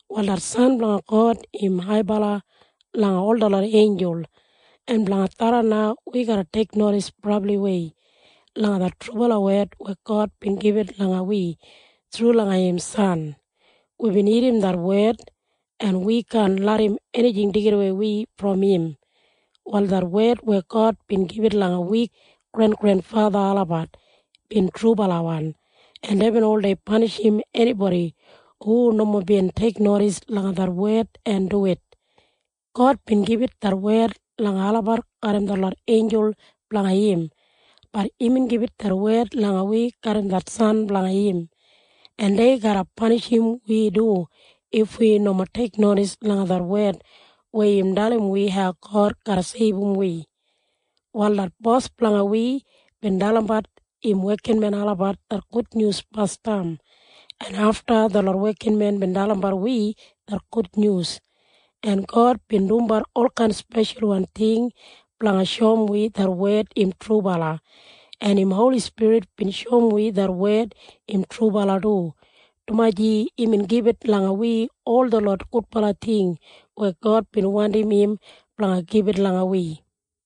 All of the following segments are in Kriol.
Wal det San blanga God im haibala langa ol detlot einjul, en blanga tharran na wi garra teiknodis brabliwei langa det trubala wed weya God bin gibit langa wi thru langa im san. Wibin irrim det wed, en wi kaan larram enijing deigidawei wi brom im. Wal det wed weya God bin gibit langa wi grengrenfatha olabat bin trubalawan, en deibin oldei panishim enibodi hu nomo bin teiknodis langa det wed en duwit. God bin gibit det wed langa olabat garram detlot einjul blanga im. Bat imbin gibit det wed langa wi garram det san blanga im, en dei garra panishim wi du if wi nomo teiknodis langa det wed weya im dalim wi hau God garra seibum wi. Wal det Bos blanga wi bin dalimbat im wekinmen olabat det gudnyus basdam, en afta detlot wekinmen bin dalimbat wi det gudnyus. En God bin dumbat olkain speshalwan ting blanga shoum wi det wed im trubala, en im Holi Spirit bin shoum wi det wed im trubala du, dumaji imbin gibit langa wi ol detlot gudbala ting weya God bin wandim im blanga gibit langa wi.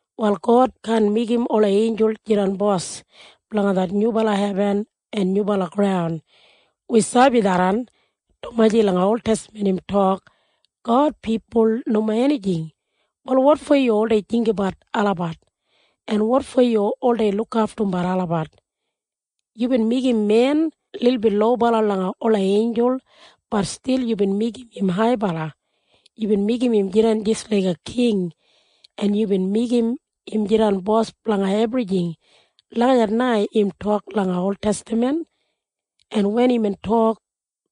Wal God kaan meigim ola einjul jidan bos blanga det nyubala hebin en nyubala graun. Wi sabi tharran, dumaji langa oltestaman im tok, “God, pipul nomo enijing. Wal wotfo yu oldei jinggabat olabat? En wotfo yu oldei lukaftumbat olabat? Yubin meigim men lilbit lobala langa ola einjul. Bat stil yubin meigim im haibala. Yubin meigim im jidan jis laiga king, en yubin meigim im jidan bos blanga ebrijing.” Lagijat na im tok langa oltestaman. En wen imbin tok,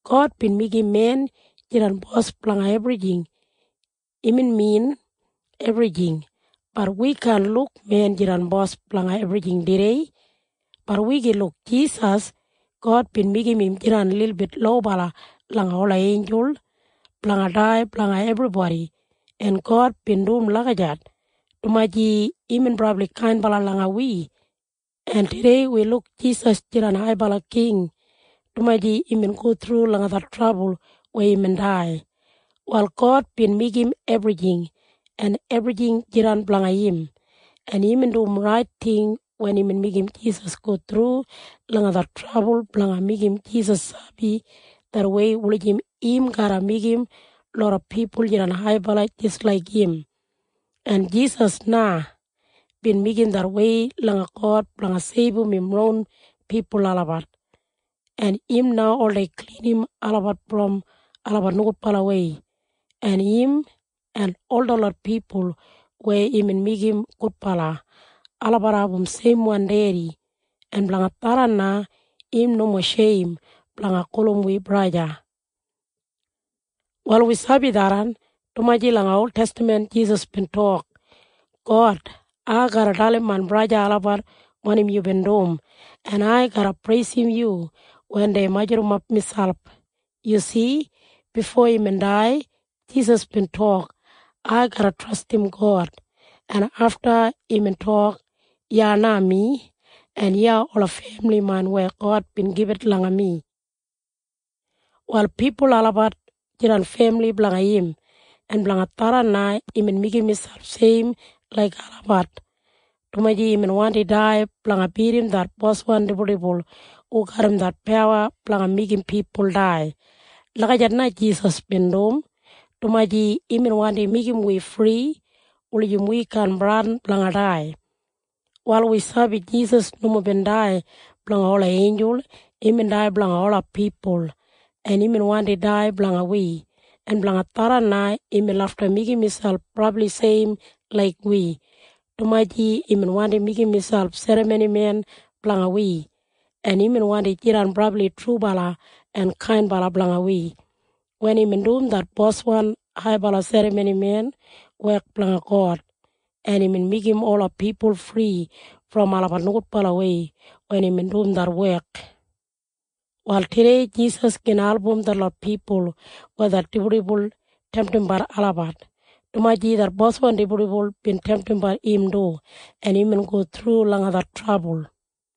“God bin meigim men jidan bos blanga ebrijing,” imbin min ebrijing. Bat wi kaan luk men jidan bos blanga ebrijing tudei. Bat wi gin luk Jisas. God bin meigim im jidan lilbit lobala langa ola einjul blanga dai blanga ebribodi, en God bin dum lagijat, dumaji imbin brabli kainbala langa wi. En tudei wi luk Jisas jidan haibala king, dumaji imbin go thru langa det trabul weya imbin dai. Wal God bin meigim ebrijing, en ebrijing jidan blanga im, en imbin dum rait ting wen imbin meigim Jisas go thru langa det trabul blanga meigim Jisas sabi det wei wulijim im garra meigim loda pipul jidan haibala jis laik im. En Jisas na bin meigim det wei langa God blanga seibum im ron pipul olabat, en im na oldei klinim olabat brom olabat nogudbalawei, en im en ol detlot pipul weya imbin meigim gudbala, olabat abum seimwan Dedi. En blanga tharran na im nomo sheim blanga gulum wi im femili olabat. Wal wi sabi tharran, dumaji langa oltestaman Jisas bin tok, “God, ai garra dalim main braja en sista olabat wanim yubin dum, en ai garra preisim yu wen dei majurrumap miselp.” Yu si? Bifo imbin dai, Jisas bin tok, “Ai garra trastim God.” En afta imbin tok, “Iya na mi, en iya ola femili main weya God bin gibit langa mi.” Wal pipul olabat jidan femili blanga im, en blanga tharran na imbin meigim miselp seim laik olabat, dumaji imbin wandi dai blanga bidim det boswan dibuldibul hu garram det pawa blanga meigim pipul dai. Lagijat na Jisas bin dum, dumaji imbin wandi meigim wi fri wulijim wi kaan bradin blanga dai. Wal wi sabi Jisas nomo bin dai blanga ola einjul. Imbin dai blanga ola pipul, en imbin wandi dai blanga wi, en blanga tharran na imbin lafta meigim miselp brabli seim laik wi, dumaji imbin wandi meigim miselp serramonimen blanga wi. En imbin wandi jidan brabli trubala en kainbala blanga wi wen imbin dum det boswan haibala serramonimen wek blanga God, en imbin meigim ola pipul fri brom olabat nogudbalawei wen imbin dum det wek. Wal tudei Jisas gin album detlot pipul weya det dibuldibul temtimbat olabat, dumaji det boswan dibuldibul bin temtimbat im du, en imbin go thru langa det trabul.